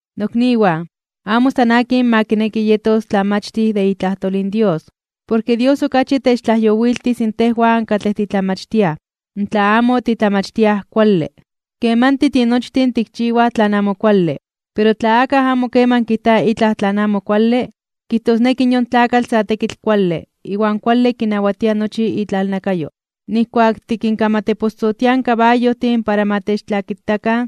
Nokniwan, amo san akin ma kineki yetos tlamachtij de itlajtol in Dios. Porke Dios okachi techtlajyowiltis tejwan katlej titlamachtiaj, tla amo titlamachtiaj kuale. Kemanti tinochtin tikchiwaj tlan amo kuale. Pero tla akaj amo keman kijta itlaj tlan amo kuale, kijtosneki yon tlakatl sa tekitl kuale, iwan kualti kinawatia nochi itlalnakayo. Nijkuak tikinkamateposotiaj in kabayojtin para ma techtlakitakan,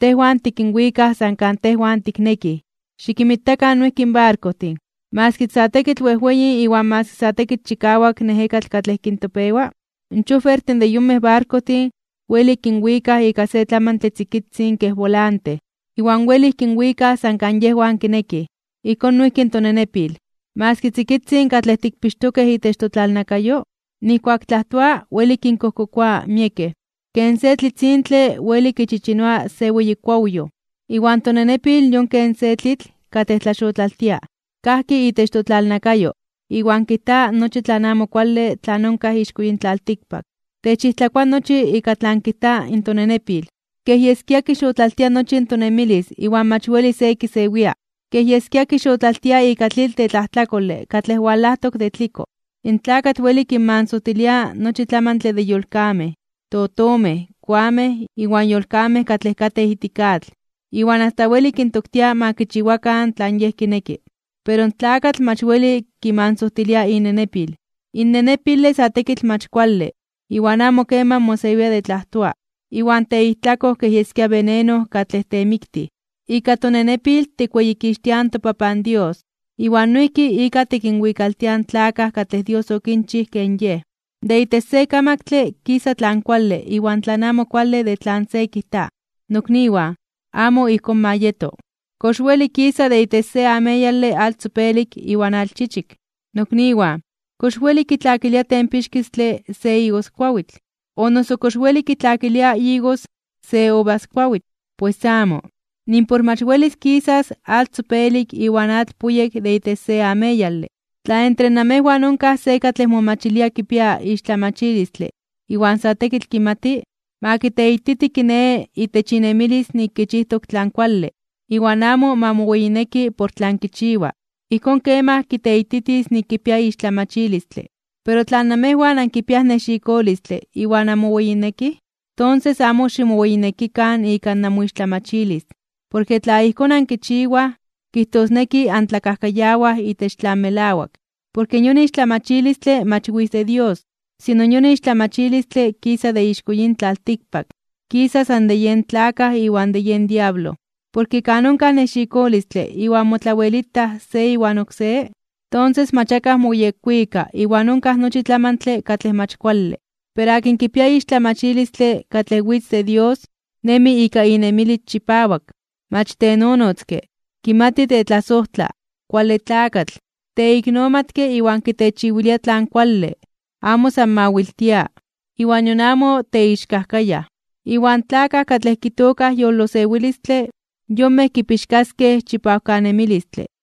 tejwan tikinwikaj san kan tejwan tiknekij. Xikinmitakan noijki in barkojtin. Maski sa tekitl wejweyin iwan maski sa tekitl chikawak in ejekatl katlej kintopewa, in chofertin de yonmej barkojtin welij kinwikaj ika se tlamantle tzikitzin kej bolante, iwan welij kinwikaj san kan yejwan kinekij. Ijkón noijki in tonenepil. Maski tzikitzin katlej tikpixtokej itech totlalnakayo, nijkuak tlajtoa weli kinkojkokoa miekej. Ken se tlitzintle weli kichichinoa se weyi kuawyoj. Iwan tonenepil yon kej se tlitl katlej tlaxotlaltia. Kajki itech totlalnakayo iwan kijta nochi tlan amo kuale tlan onkaj ixko yin tlaltikpak. Techijtlakoa nochi ika tlan kijta in tonenepil. Kej yeskia kixotlaltia nochi in tonemilis iwan mach weli se kisewia, kej yeskia kixotlaltia ika tlitl de tlajtlakole katlej walajtok de tliko. In tlakatl weli kinmansojtilia nochi tlamantle de yolkamej, totomej, koamej, iwan yolkamej katlej katej ijtik atl, iwan asta weli kintoktia ma kichiwakan tlan yej kineki. Pero in tlakatl mach weli kimansojtilia inenepil. In nenepile sa tekitl mach kuale iwan amo keman mosewia de tlajtoa, iwan teijtlakoj kej yeskia veneno katlej temiktij. Ika tonenepil tikweyikixtiaj in toPapan Dios, iwan noijki ika tikinwikaltiaj in tlakaj katlej Dios okinchij ken Yej. De itech se kamaktle kisa tlan kuale iwan tlan amo kuale de tlan se kijta. Nokniwan, amo ijkón ma yeto. ¿Kox weli kisa de itech se ameyale atl tzopelik iwan atl chichik? Nokniwan, ¿kox weli kitlakilia tempixkistle se igoskuawitl, o noso kox weli kitlakilia igos se uvaskuawitl? ¡Pues amo! Nimpor mach welis kisas atl tzopelik iwan atl puyek de itech se ameyale. Tla entre namejwan onkaj se katlej momachilia kipia ixtlamachilistle iwan sa tekitl kimati, ma kiteititi kiné itech inemilis nik kichijtok tlan kuale, iwan amo ma moweyineki por tlan kichiwa. Ijkón kemaj kiteititis nik kipia ixtlamachilistle. Pero tla namejwan ankipiaj nexikolistle iwan anmoweyinekij, tonses amo ximoweyinekikan ika namoixtlamachilis. Porke tla ijkón ankichiwaj, kijtosneki antlakajkayawaj itech tlan melawak. Porke yon ixtlamachilistle mach witz de Dios, sino yon ixtlamachilistle kisa de ixko yin tlaltikpak, kisa san de yen tlakaj iwan de yen diablo. Porke kan onkaj nexikolistle iwan motlawelitaj se iwan oksé, tonses mach akaj moyekwika iwan onkaj nochi tlamantle katlej mach kuale. Pero akin kipia ixtlamachilistle katlej witz de Dios, nemi ika inemilis chipawak. Mach tenonotzke, kimati tetlasojtla, kuale tlakatl, teiknomatke iwan kitechiwilia tlan kuale. Amo san mawiltia, iwan nion amo teixkajkayaj. Iwan tlakaj katlej kitookaj yolosewilistle, yonmej kipixkaskej chipawkanemilistle.